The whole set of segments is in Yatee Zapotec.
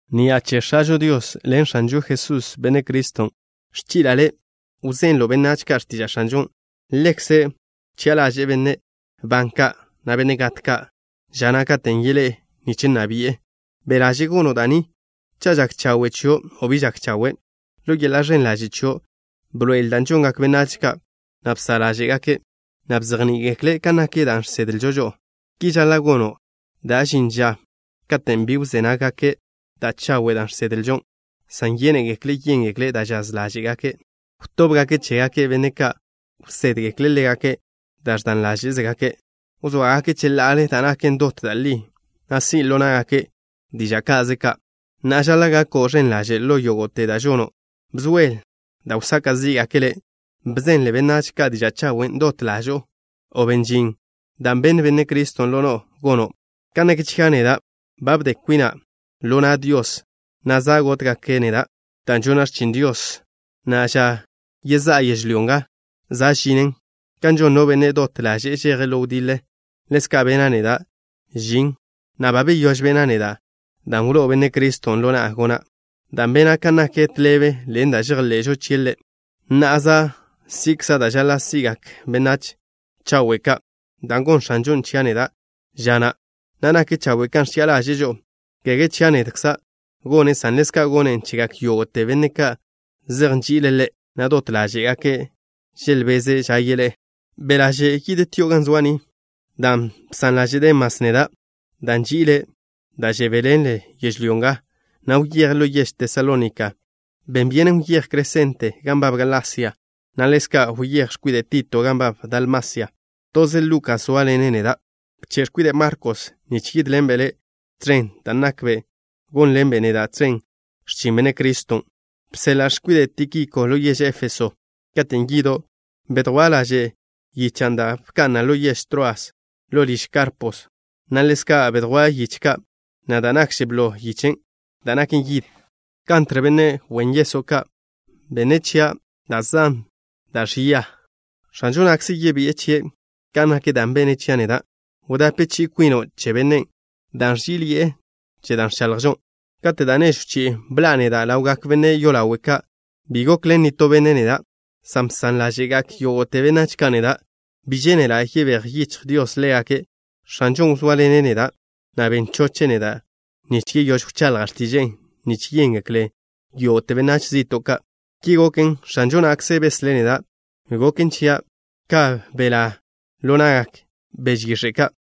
Ni'a che X̱ažo Dios ḻen X̱anžo Jesús, Benne' Criston', ẕchi'la' le' wzenlo' benách ka' x̱tiža' X̱anžon'. Ḻekze' wchi'a ḻaže'e benne' ban ka', na' benne' gat ka', ža na' katen' yeḻé'e nich nna bi'e. Be' ḻaže' gono' da' ni, cha' žak chawe' chio' o bi žak chawe'. Ḻo yeḻa' ẕen ḻaže' chio', bḻoe'el dan' žongak benách ka', na' bsa' ḻáže'gake', na' bzejní'i-gekle' kan nak dan' žsedlžo žo'o. Ki žaḻa' gono' dan' žin ža katen' bi wzé nággake' da' chawe' da' žsedlžo, san yénegekle' yéngekle' da' žaz ḻáže'zegake'. Wtóbgake' chégake' benne' ka' wsédgekle' ḻégake' da' ẕdan ḻáže'zegake'. Wzóagake' cheḻa'ale da' naken dot da' li, na' si' ḻo ná'gake' diža' ka'ze ka'. Na'a, žaḻa' gako' ẕen ḻaže' ḻo yógo'te da' žono'. Bzóel da' wsaka' zí'gake' le'. Bzenle benách ka' diža' chawen'. Dot ḻažo'o ben žin dan' wló'o Benne' Criston' ḻo no'o gono'. Kan nak chia' neda', ba bde kwina' ḻo na' Dios, na' za' gótgake' neda' dan' žona' x̱chin Dios, na' ža yezá'a yežlyó nga za' žinen. Kan žon no benne' dot ḻaže'e žeje' ḻo wdiḻe, ḻezka' bena' neda' žin, na' ba beyóž bena' neda' dan' wló'o Benne' Criston' ḻo na'a gona', dan' bena' kan nak tḻebe ḻen da' žejḻe'žo chie' Ḻe'. Na'a za' si'kza' da' žaḻa' si'gak benne' chawe' ka', dan' gonn X̱anžon' chia' neda' ža na', na' nak chawe' kan ẕchi'a ḻaže'e žo'o. Kege chia' nedza' gonnen', san ḻezka' gonnen' chegak yógo'te benne' ka' zej nži'ile' Ḻe', na' dot ḻáže'gake' želbeze' ža yeḻé'e. Be' ḻaže' yidtio' ga zoa' ni, dan' bsan ḻaže' Demas neda', dan' nži'ile' da' žebéḻenle' yežlyó nga, na' wyeje' ḻo yež Tesalónika. Ben byenen wyéj Cresente gan nbab Galasia, na' ḻezka' wyéj x̱kwide' Tito gan nbab Dalmasia. Toze Lukas zóaḻene' neda'. Bche' x̱kwide' Markos nich yídḻenbe' le' tẕen, dan' nakbe' gónḻenbe' neda' tẕen x̱chin Benne' Criston'. Bseḻa'a x̱kwide' Tíkiko ḻo yež Éfeso. Katen' yido', bedjwá' laže' yichan' dan' bka'na' ḻo yež Troas ḻo liž Karpo, na' ḻezka' bedjwá' yiche ka', na' da' nakže blo, yichen' da' naken yid. Kantr, benne' wen yeso' ya ka', bene' chia' da' zan da' ẕia. X̱anžo na'kze yebi'e chie' kan nak da' bene' chia' neda'. Wdape chi'i kwino' che bennen', dan' ẕží'iḻi'e che da' ẕchaḻjžo. Kate' da' nežw chi'i bḻa'a neda' ḻawgak benne' yolawe' ka', bi gokḻen nitó benne' neda', san bsan ḻáže'gak yógo'te benách ka' neda'. Bi žénela' yebéj yichj Dios ḻégake'. X̱anžon' wzóaḻene' neda', na' ben choche' neda' nich yeyóž wchaḻja' x̱tiže'e nich yéngeklen yógo'te benách zi'to' ka'. Ki goken, X̱anžo na'kze beslé' neda'. Goken chia' ka belá' ḻo na'gak beže yix̱e' ka'.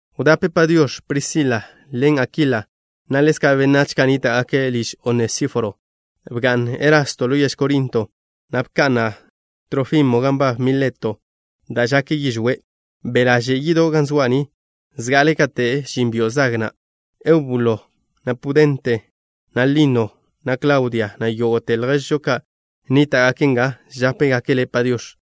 Wdape “Padiox̱” Prisila ḻen Akila, na' ḻezka' benách ka' nníta'gake' liž Onesíforo. Bga'n Erasto ḻo yež Korinto, na' bka'na' Trófimo gan nbab Mileto dan' žake' yižwé'. Be' ḻaže' yido' ga zoa' ni zga'ale kate' žin byo' zag ka'. Eubulo, na' Pudente, na' Lino, na' Klaudia, na' yógo'te lježžo ka' nníta'gake' nga, žápegake' le' “Padiox̱.”